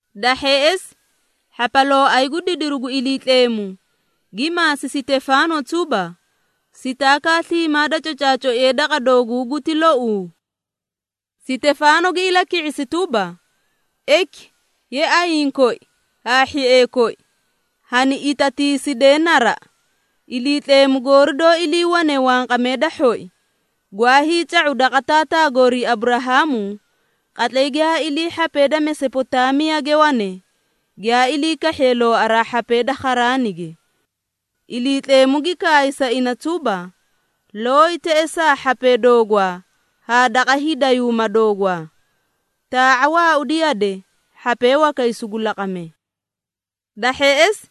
Da hheꞌesi hhapalooay gu didiru gu Iliitleemu gi maasi Sitefaano tuba, “Sitaakaa sliimaa da cocaacoiye daqa dooguu guti louu?” Sitefaano gi ilaki⁄isi tuba, “Eki ye ayiĩ koi haa hhiee koi hani itatiisidee naraꞌa! Iliitleemu goori doó iliiwane wanqamee da hhoi, gwaa hiica⁄u daqa taataa goorii Aburahaamu qatlay giyaa ilii hhapee da Mesopotaamiyage wane, giyaa ilii kahhiye looaraa hhapee da Kharaanige. Iliitleemu gi kaay sa ina tuba, ‘Looyi teꞌesaa hhapee doogwaa haa daqa hiidayuuma doogwaa. Taa⁄a waaudi yade, hhapee wakay sugu laqame.’ Da hheꞌesi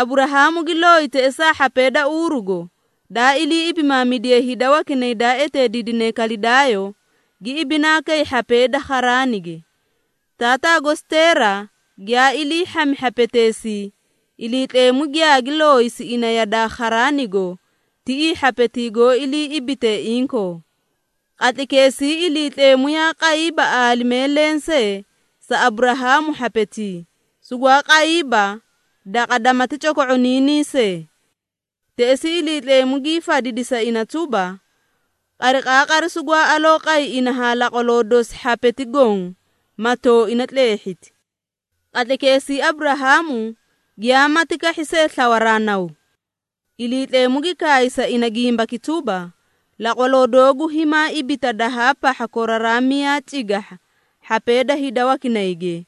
Aburaamu gi looyi teꞌesaa hhapee da Uurugo daa ilii ibimaamidiye hida wakinay daa eteediidine Kalidaayo, gi ibinaa kay hhapee da Kharaanige. Taataa gosi Teera giyaa ilii hhami hhapeteesii, Iliitleemu giyaagi looyisi ina yadaa Kharaanigo tiꞌii hhapetii goó ilii ibitee inkoo. Qatlaykeesii Iliitleemu yaa qayiiba aalimee lensee sa Aburahaamu hhapetii, sugwaa qayiiba daqa damati coko⁄oniinii see. Teꞌesii Iliitleemu gii fadidi sa ina tuba, ‘Qariqaaqari sugwaa aloo qay ina haa laqwaloo dosi hhapeti goõ, ma tooina tleehhiti. Qatlaykeesii Aburahaamu giyaamati kahhi see slawaraa naw.’ Iliitleemu gi kaay sa ina gimbaki tuba, ‘Laqwaloo doogu himaa ibita dahaa pahha koraraa miyaa cigahha hhapee da hida wakinayge,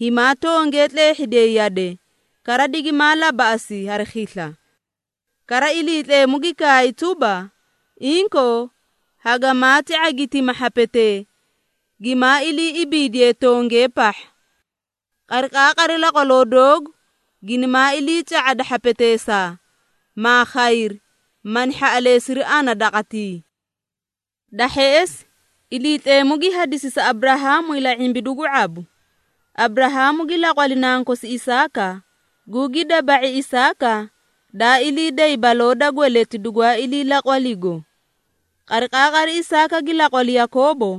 himaa tongee tleehhidiyay yade, kara digimaa labaꞌasi hari khisla.’ Kara Iliitleemu gi kaay tuba, ‘Inkoo, hagamaati ⁄agitima hhapetee, gimaa ilii ibiidiyee tongee pahha. Qariqaaqari laqwaloo doogu ginimaa iliica⁄ada hhapeteesaa, maa khayri, mani hhaꞌaleesiri ana daqatii.’ Da hheꞌesi Iliitleemu gi hadisi sa Aburahaamu ila⁄imbidu gu daba⁄u. Aburahaamu gi laqwali nankosi Isaaka, gugi daba⁄i Isaaka daa ilii day baloo da dagati dugwaa ilii laqwaligo. Qariqaaqari Isaaka gi laqwali Yakoobo,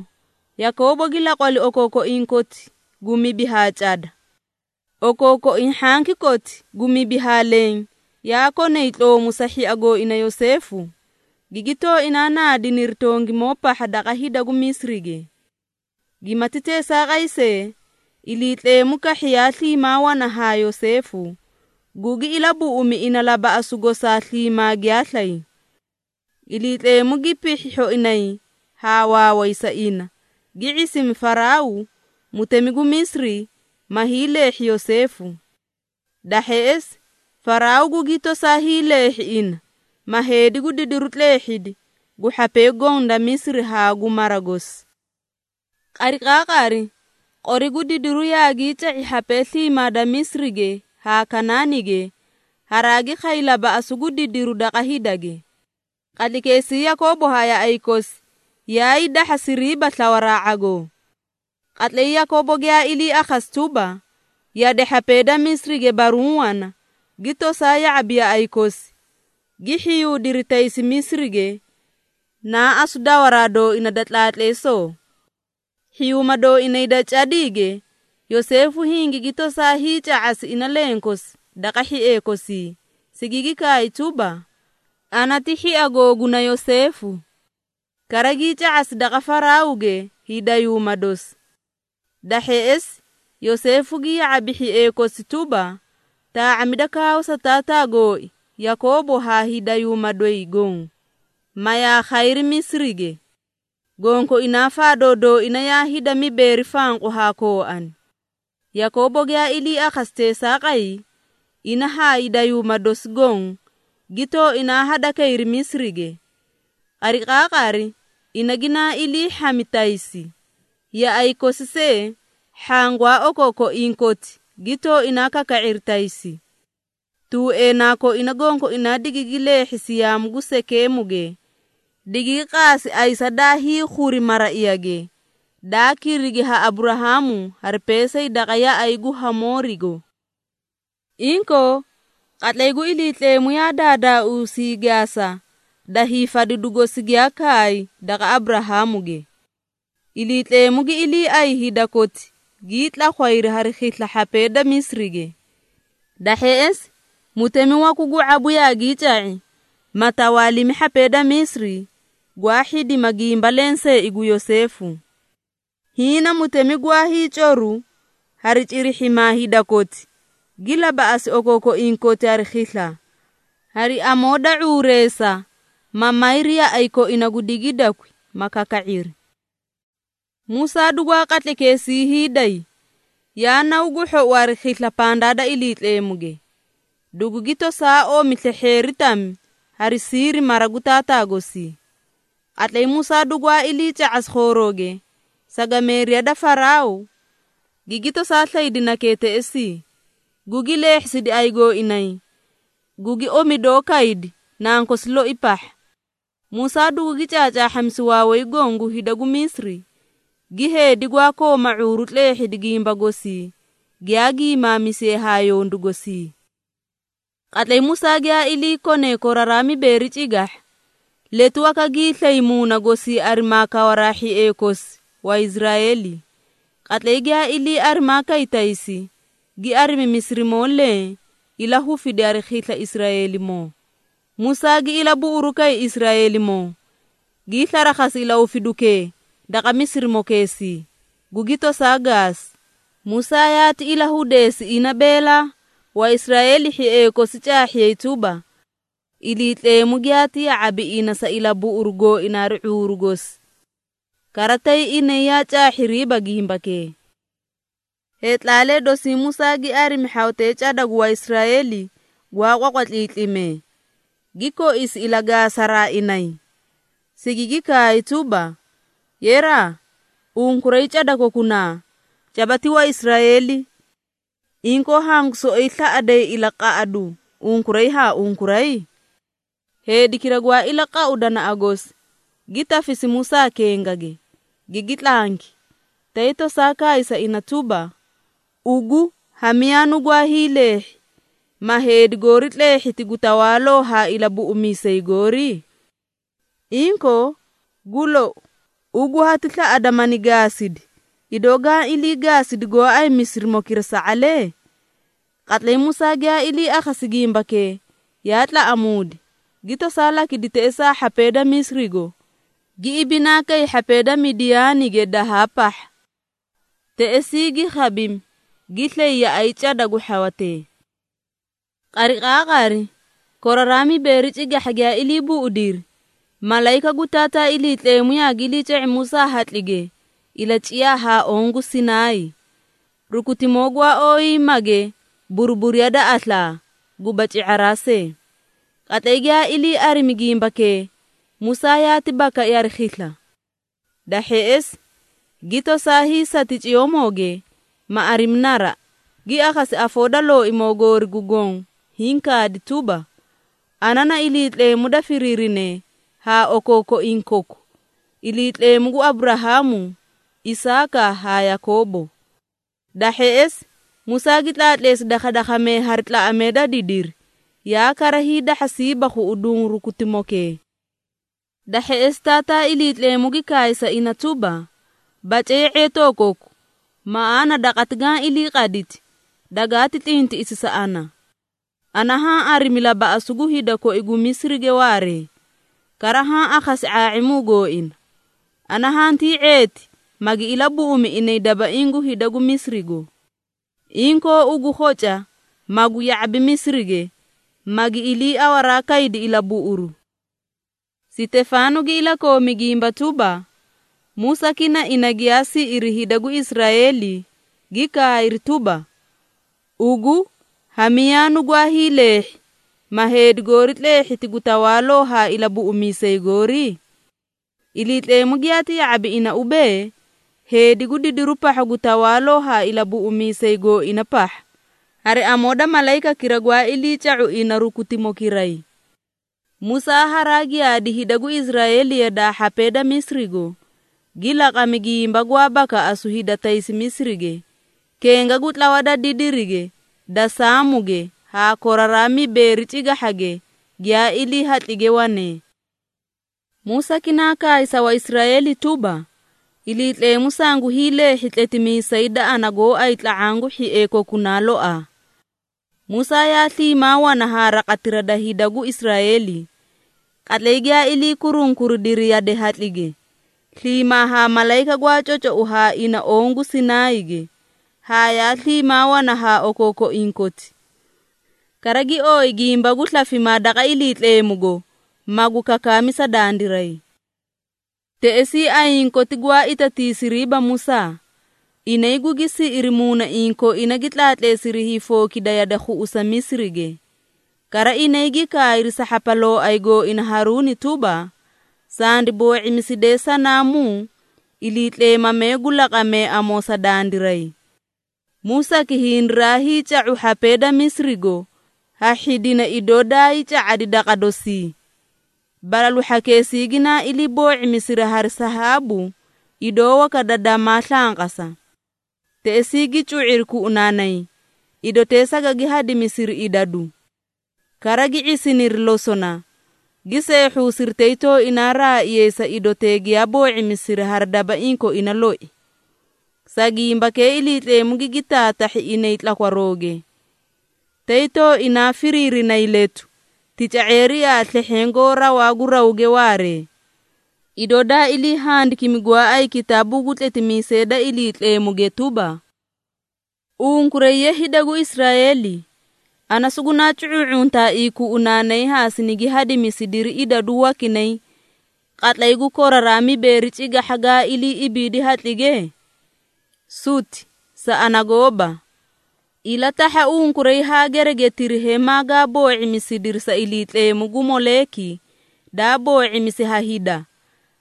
Yakoobo gi laqwali okookoiĩ koti gu mibi haa cada. Okookoiĩ hhanki koti gu mibi haa leẽ yaa konay tloomu sa hhia gooina Yoseefu, gigi tooinaa naadiniri tongimoo pahha daqa hida gu Misirige. Gimati teesaaqay see, Iliitleemu kahhi yaa sliimaa wana haa Yoseefu, gugi ilabuꞌumi ina labaꞌasu gosaa sliimaa giyaa slay. Iliitleemu gi pihhi hhoinay haa waaway sa ina, gi ⁄isimi Faraaw, mutemi gu Misiri, ma hiileehhi Yoseefu. Da hheꞌesi Faraaw gugi tosaa hiileehhi ina, ma heedi gu didiri tleehhidi gu hhapee goõ da Misiri haa gu mara gosi. Qariqaaqari qori gu didiru yaagii ca⁄i hhapee sliimaa da Misirige haa Kanaanige, haraagi khay labaꞌasu gu didiri daqa hidage. Qatlaykeesii Yakoobo haa yaꞌay kosi yaay dahhasiriiba slawaraa ⁄agoo. Qatlay Yakoobo giyaa ilii akhasi tuba, yade hhapee da Misirige baruũ wana, gi tosaa ya⁄abi yaꞌay kosi, gi hhiyuudiri taysi Misirige naa asu dawaraa dooina da tlaatleesoo. Hhiyuuma dooinay da cadiige, Yoseefu hingigi tosaa hiica⁄asi ina lenkosi daqa hhiee kosii, sigigi kaay tuba, ‘Ana ti hhia googuna Yoseefu.’ Kara gii ca⁄asi daqa Faraawge hiidayuuma dosi. Da hheꞌesi Yoseefu gi ya⁄abi hhiee kosi tuba, taa⁄amida kaawa sa taataa gooi Yakoobo haa hiidayuuma doyi goõ, ma yaa khayri Misirige. Gonkoinaa faadoo dooina yaa hida mibeeri fanqu haa kooani. Yakoobo giyaa ilii akhasi teesaaqay, ina haa hiidayuuma dosi goõ gi tooinaa hadakayri Misirige. Qariqaaqari ina ginaa ilii hhami taysi, yaꞌay kosi see hhaã gwaa okookoiĩ koti gi tooinaa kaka⁄iri taysi. Tuueenaa koina gonkoinaa digigi leehhisi yaamu gu Sekeemuge, digigi qaasi ayisa daa hiikhuri maraiyage, daa kirigi ha Aburahaamu hari peesay daqa yaꞌay gu Hamoorigo. Inkoo, qatlay gu Iliitleemu yaa daadaauusi hiigaasa da hiifadidu gosi giyaa kaay daqa Aburahaamuge. Iliitleemu gi iliiay hida koti gii tlakhwayri hari khisla hhapee da Misirige. Da hheꞌesi mutemi waku gu ⁄abu yaagii ca⁄i, ma tawaalimi hhapee da Misiri, gwaa hhidima gimba lenseei gu Yoseefu. Hiĩ na mutemi gwaa hiicoru hari cirihhimaa hida koti, gi labaꞌasi okookoiĩ koti hari khisla, hari amoo da ⁄uureesa ma mayri yaꞌay koina gu digiidakwi, ma kaka⁄iri. Musaa dugwaa qatlaykeesii hiiday, yaa naw gu hhou hari khisla pandaa da Iliitleemuge. Dugugi tosaa omi slehheeri tami hari siiri mara gu taataa gosii. Qatlay Musaa dugwaa iliica⁄asi khoorooge, sagameeriya da Faraaw gigi tosaa slaydi nakee teꞌesii, gugi leehhisidi ayigooinayi, gugi omidoo kaydi nankosi loi pahha. Musaa dugugi caacaahhamisi waaway goõ gu hida gu Misiri, gi heedi gwaa kooma ⁄uuru tleehhidi gimba gosii giyaa giimaamisiye haa yondu gosii. Qatlay Musaa giyaa ilii kone koraraa mibeeri cigahha, letu waka giislay muuna gosii arimaa kawaraa hhiee kosi Waisraeeli. Qatlay giyaa ilii arimaa kay taysi, gi arimi Misirimoo leẽ ilahufidi hari khisla Israeelimoo. Musaa gi ilabuꞌuru kay Israeelimoo, gii slarakhasi ilahufidukee daqa Misirimokeesii, gugi tosaa gaasi. Musaa yaati ilahudeesi ina beelaa, Waisraeeli, hhiee kosi caahhiyay tuba, Iliitleemu giyaati ya⁄abi ina sa ilabuꞌuru gooina hari ⁄uuru gosi. Kara tay inay yaa caahhiriiba gimbakee. Heetlaalee dosii Musaa gi arimi hhawatee cada gu Waisraeeli gwaa qwaqwatliitlimee, gi koisi ilagaasaraa inay, sigigi kaay tuba, ‘Yeraa, unkuray cada kokunaa, caba ti Waisraeeli. Inkoo hangu soꞌoyi slaꞌaday ilaqaꞌadu unkuray haa unkuray?’ Heedikira gwaa ilaqau danaꞌa gosi, gi tafisi Musaa kengage, gigi tlanki, tay tosaa kaay sa ina tuba, ‘Ugu! Ha miyaa nugwaa hiileehhi, ma heedi goori tleehhiti gu tawaaloo haa ilabuꞌumiisay goori? Inkoo gu lou, ugu hati slaꞌadaa mani gaasidi, idoo gaã ilii gaasidi gooay Misirimokira sa⁄alee?’ Qatlay Musaa giyaa ilii akhasi gimbakee, yaa tlaꞌamuudi, gi tosaa lakidi teꞌesaa hhapee da Misirigo, gi ibinaa kay hhapee da Midiyaanige dahaa pahha. Teꞌesii gi khabimi, gi slay yaꞌay cada gu hhawatee. Qariqaaqari, koraraa mibeeri cigahha giyaa ilii buꞌudiri, malayika gu Taataa Iliitleemu yaagi iliica⁄i Musaa hatlige ilaciyaa haa oõ gu Sinaay, rukutimoo gwaa ooyiiyimage buruburiya da aslaa, guba ci⁄araa see. Qatlay giyaa ilii arimi gimbakee Musaa yaati bakai hari khisla. Da hheꞌesi gi tosaa hiisati ciyoomooge ma arimi naraꞌa, gi akhasi afoo da Looimoo goori gu Goõ hiĩ kaadi tuba, ‘Ana na Iliitleemu daa firiirine ha okookoiĩ koku, Iliitleemu gu Aburahaamu, Isaaka haa Yakoobo.’ Da hheꞌesi Musaa gi tlaatleesi dakhadakhamee hari tlaꞌamee da didiri, yaa kara hiidahhasiiba khuꞌuduũ rukutimokee. Da hheꞌesi Taataa Iliitleemu gi kaay sa ina tuba, ‘Bace ye⁄etoo koku, maꞌaana daqati gaã ilii qadidi, dagaati tlintiꞌisi sa ana. Ana haã arimi labaꞌasu gu hida koi gu Misirige waaree, kara haã akhasi ⁄aa⁄imuu gooina. Ana hantii ⁄eeti, magi ilabuꞌumi inay dabaiĩ gu hida gu Misirigo. Inkoo ugu khoca, magu ya⁄abi Misirige, magi iliiawaraa kaydi ilabuꞌuru.’” Sitefaano gi ilakoomi gimba tuba, “Musaaki na ina giyaa siꞌiri hida gu Israeeli gi kaayri tuba, ‘Ugu! Ha miyaa nugwaa hiileehhi, ma heedi goori tleehhiti gu tawaaloo haa ilabuꞌumiisay goori?’ Iliitleemu giyaati ya⁄abi ina ubee, heedi gu didiru pahha gu tawaaloo haa ilabuꞌumiisay gooina pahha, hari amoo da malayikakira gwaa ilii ca⁄u ina rukutimokiray. Musaa haraa giyaadi hida gu Israeeli yadaa hhapee da Misirigo, gi laqami gimba gwaa bakaꞌasu hida taysi Misirige, kenga gu tlawa da didirige da Saamuge haa koraraa mibeeri cigahhage giyaa ilii hatlige wanee. Musaaki naa kaay sa Waisraeeli tuba, ‘Iliitleemu sangu hiileehhi tletimiisay da ana gooay tla⁄aã gu hhiee kokunaa loaa.’ Musaa yaa sliimaa wana haa raqatira da hida gu Israeeli, qatlay giyaa ilii kurunkuridiri yade hatlige, sliimaa haa malayika gwaa cocou haa ina oõ gu Sinaayige, haa yaa sliimaa wana haa okookoiĩ koti. Kara gi ooyi gimba gu slafimaa daqa Iliitleemugo, magu kakaami sa dandiray. Teꞌesii ayiĩ koti gwaa itatiisiriiba Musaa. Inay gugi siꞌiri muunaiĩ koina, gi tlaatleesiri hiifookida yade khuꞌusa Misirige. Kara, inay gi kaayri sa hhapalooay gooina Haruuni tuba, ‘Sandi boo⁄imiside sanaamuu iliitleemamee gu laqamee amoo sa dandiray. Musaaki hindiray ca⁄u hhapee da Misirigo ha hhidina idoo daayii ca⁄adi daqa dosii.’ Balalu hhakeesii ginaa ilii boo⁄imisiri hari sahaabu idoo waka da damaa slanqasa. Teꞌesii gi cu⁄iri kuꞌunaanay, idotee sagagi hadimisiri idadu. Kara gi ⁄isiniri losona, gi seehhuusiri tay tooinaa raaiyay sa idotee giyaa boo⁄imisiri hari dabaiĩ koina loi. Sa gimbakee Iliitleemu gigi taatahhi inay tlakwarooge, tay tooinaa firiirinay letu, tica⁄eerii haa slehheẽ goó rawaa gu rawge waaree, idoo daa ilii handikimi gooay kitaabuu gu tletimiisee da Iliitleemuge tuba, ‘Unkuray! Ye hida gu Israeeli, ana sugunaa cu⁄uu⁄untaaii kuꞌunaanay, haa sinigi hadimisidiri idadu wakinay, qatlay gu koraraa mibeeri cigahha gaa ilii ibiidi hatlige? Suti sa ana gooba! Ilatahha unkuray haa geregetiri hemaa gaa boo⁄imisidiri sa iliitleemu gu Moleeki daa boo⁄imisi ha hida,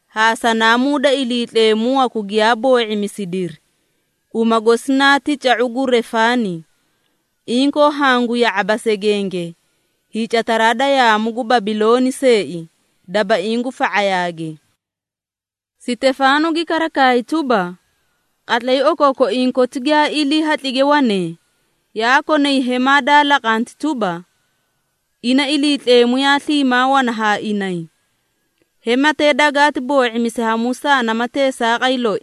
haa sanaamuu da iliitleemu waku giyaa boo⁄imisidiri, uma gosi naa tica⁄u gu Refaani, Inkoo hangu ya⁄aba segenge, hiicataraa da yaamu gu Babilooni seei, dabaiĩ gu fa⁄ayaage.’” Sitefaano gi kara kaay tuba, “Qatlay okookoiĩ koti giyaa ilii hatlige wanee, yaa konay hemaa daa laqanti tuba, ina Iliitleemu yaa sliimaa wana haa inay. Hematee dagaati boo⁄imisi ha Musaa nama teesaaqay loi,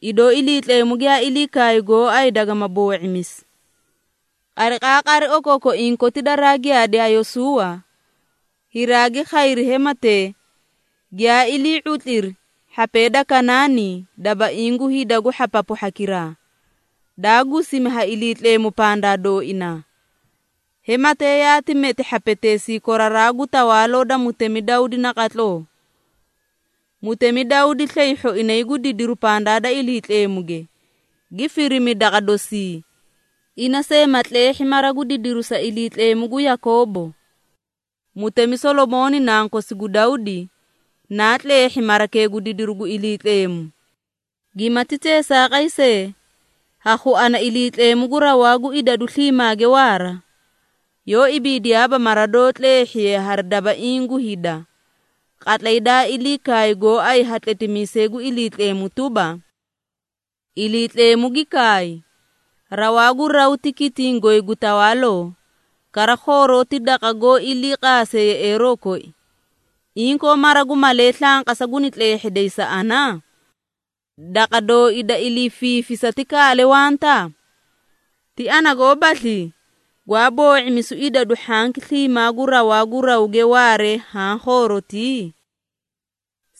idoo Iliitleemu giyaa ilii kaay gooay dagama boo⁄imisi. Qariqaaqari okookoiĩ koti daraa giyaadi ha Yosuuwa, hiraagi khayri hematee, giyaa ilii⁄utliri hhapee da Kanaani dabaiĩ gu hida gu hhapapu hhakiraa, daa gusimi ha Iliitleemu pandaa dooinaa. Hematee yaati meti hhapeteesii koraraa gu tawaaloo da mutemi Dawdi naqatloo. Mutemi Dawdi slay hhoinay gu didiru pandaa da Iliitleemuge, gi firimi daqa dosii, ina see ma tleehhi mara gu didiru sa Iliitleemu gu Yakoobo. Mutemi Solomooni nankosi gu Dawdi, naa tleehhi marakee gu didiru gu Iliitleemu. Gimati teesaaqay see, ha khuana Iliitleemu gu Rawaa gu Idadu Sliimaage Waara, yoó ibiidiyaaba mara doó tleehhiye hari dabaiĩ gu hida, qatlay daa ilii kaay gooay ha tletimiisay gu Iliitleemu tuba, ‘Iliitleemu gi kaay, Rawaa gu raw ti kitiĩ goy gu tawaaloo, Kara khooroo ti daqa goó ilii qaase yeꞌeeroo koi, inkoo mara gu malee slanqasa guni tleehheday sa ana? Daqa dooi da ilii fiifisa ti kaale wanta? Ti ana goobaslii, gwaa boo⁄imisu idadu hhanki sliimaa gu rawaa gu rawge waaree haã khoorotii?’”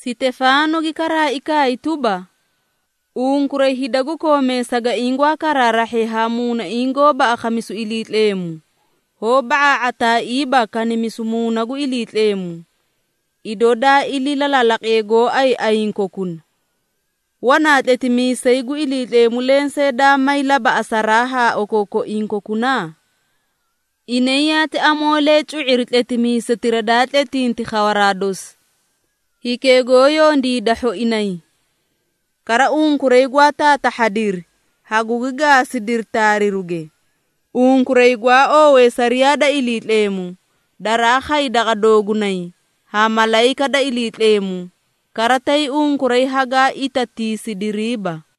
Sitefaano gi karaai kaay tuba, “Unkuray hida gu koomee sagaiĩ gwaa karaarahhee haa muunaiĩ goóba akhamisu Iliitleemu, hoó ba⁄aa⁄ataaiiba kanimisu Muuna gu Iliitleemu, idoo daa ilii lalaalaqiye gooay ayiĩ kokuna! Wanaa tletimiisay gu Iliitleemu lensee daa may labaꞌasaraa ha okookoiĩ kokuna? Inay yaati amoolee cu⁄iri tletimiisetira daa tletinti khawaraa dosi, Hikee goó Yondiida Hhoinay. Kara, unkuray gwaa taatahhadiri, hagugi gaasidiri taariruge. Unkuray gwaa oowee sariyaa da Iliitleemu, daraa khay daqa doogunay ha malayika da Iliitleemu, kara tay unkuray hagaa itatiisidiriiba.”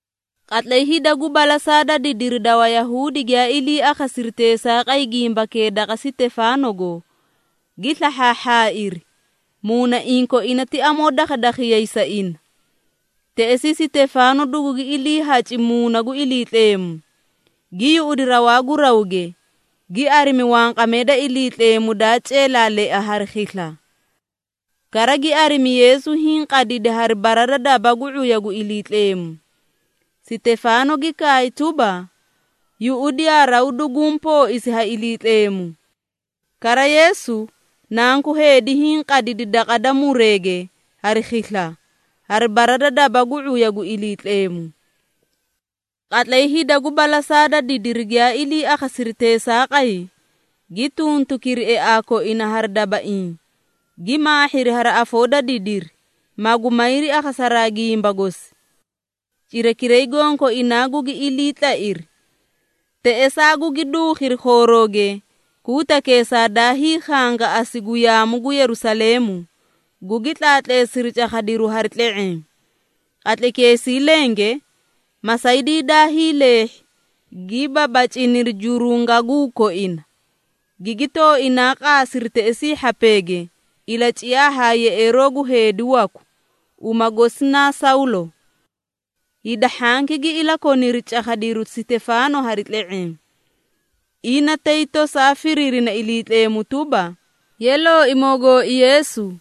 Qatlay hida gu balasaa da didiri da Wayahuudi giyaa ilii akhasiri teesaaqay gimbakee daqa Sitefaanogo, gi slahhaahhaairi, muunaiĩ koina ti amoo dakhadakhiyay sa ina. Teꞌesii Sitefaano dugugi iliihaci Muuna gu Iliitleemu, gi yuꞌudi rawaa gu rawge, gi arimi wanqamee da Iliitleemu daa ceelaalea hari khisla. Kara gi arimi Yeesu hiĩ qadidi hari bara da daba gu ⁄uya gu Iliitleemu. Sitefaano gi kaay tuba, “Yuꞌudiyaa raw duguũ pooisi ha Iliitleemu. Kara Yeesu, Nanku Heedi, hiĩ qadidi daqa da mureege hari khisla, hari bara da daba gu ⁄uya gu Iliitleemu.” Qatlay hida gu balasaa da didiri giyaa ilii akhasiri teesaaqay, gi tuntukiri eaa koina hari dabaiĩ, gi maahhiri hari afoo da didiri, magu mayri akhasaraa gimba gosi. Cirakiray gonkoinaa gugi ilii tlairi, teꞌesaa gugi duukhiri khoorooge kuutakeesaa daa hiikhangaꞌasi gu yaamu gu Yerusaleemu, gugi tlaatleesiri cakhadiruu hari tle⁄eẽ. Qatlaykeesii lenge, masaydii daa hiileehhi, gi babaciniri jurungaguu koina, gigi tooinaa qaasiri teꞌesii hhapeege ilaciyaa haa yeꞌeeroo gu heedi waku, uma gosi naa Sawlo. Hida hhanki gi ilakoniri cakhadiru Sitefaano hari tle⁄eẽ, ina tay tosaa firiirina Iliitleemu tuba, “Ye Looimoo gooi Yeesu,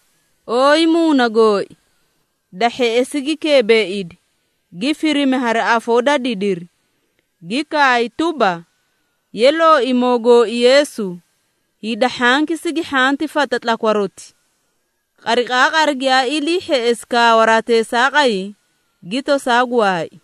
ooyi muuna gooi!” Da hheꞌesi gi keebeeidi, gi firimi hari afoo da didiri, gi kaay tuba, “Ye Looimoo gooi Yeesu, hida hhanki sigi hhanti fata tlakwaroti.” Qariqaaqari giyaa ilii hheꞌesi kaawaraa teesaaqay, gi tosaa gwaai.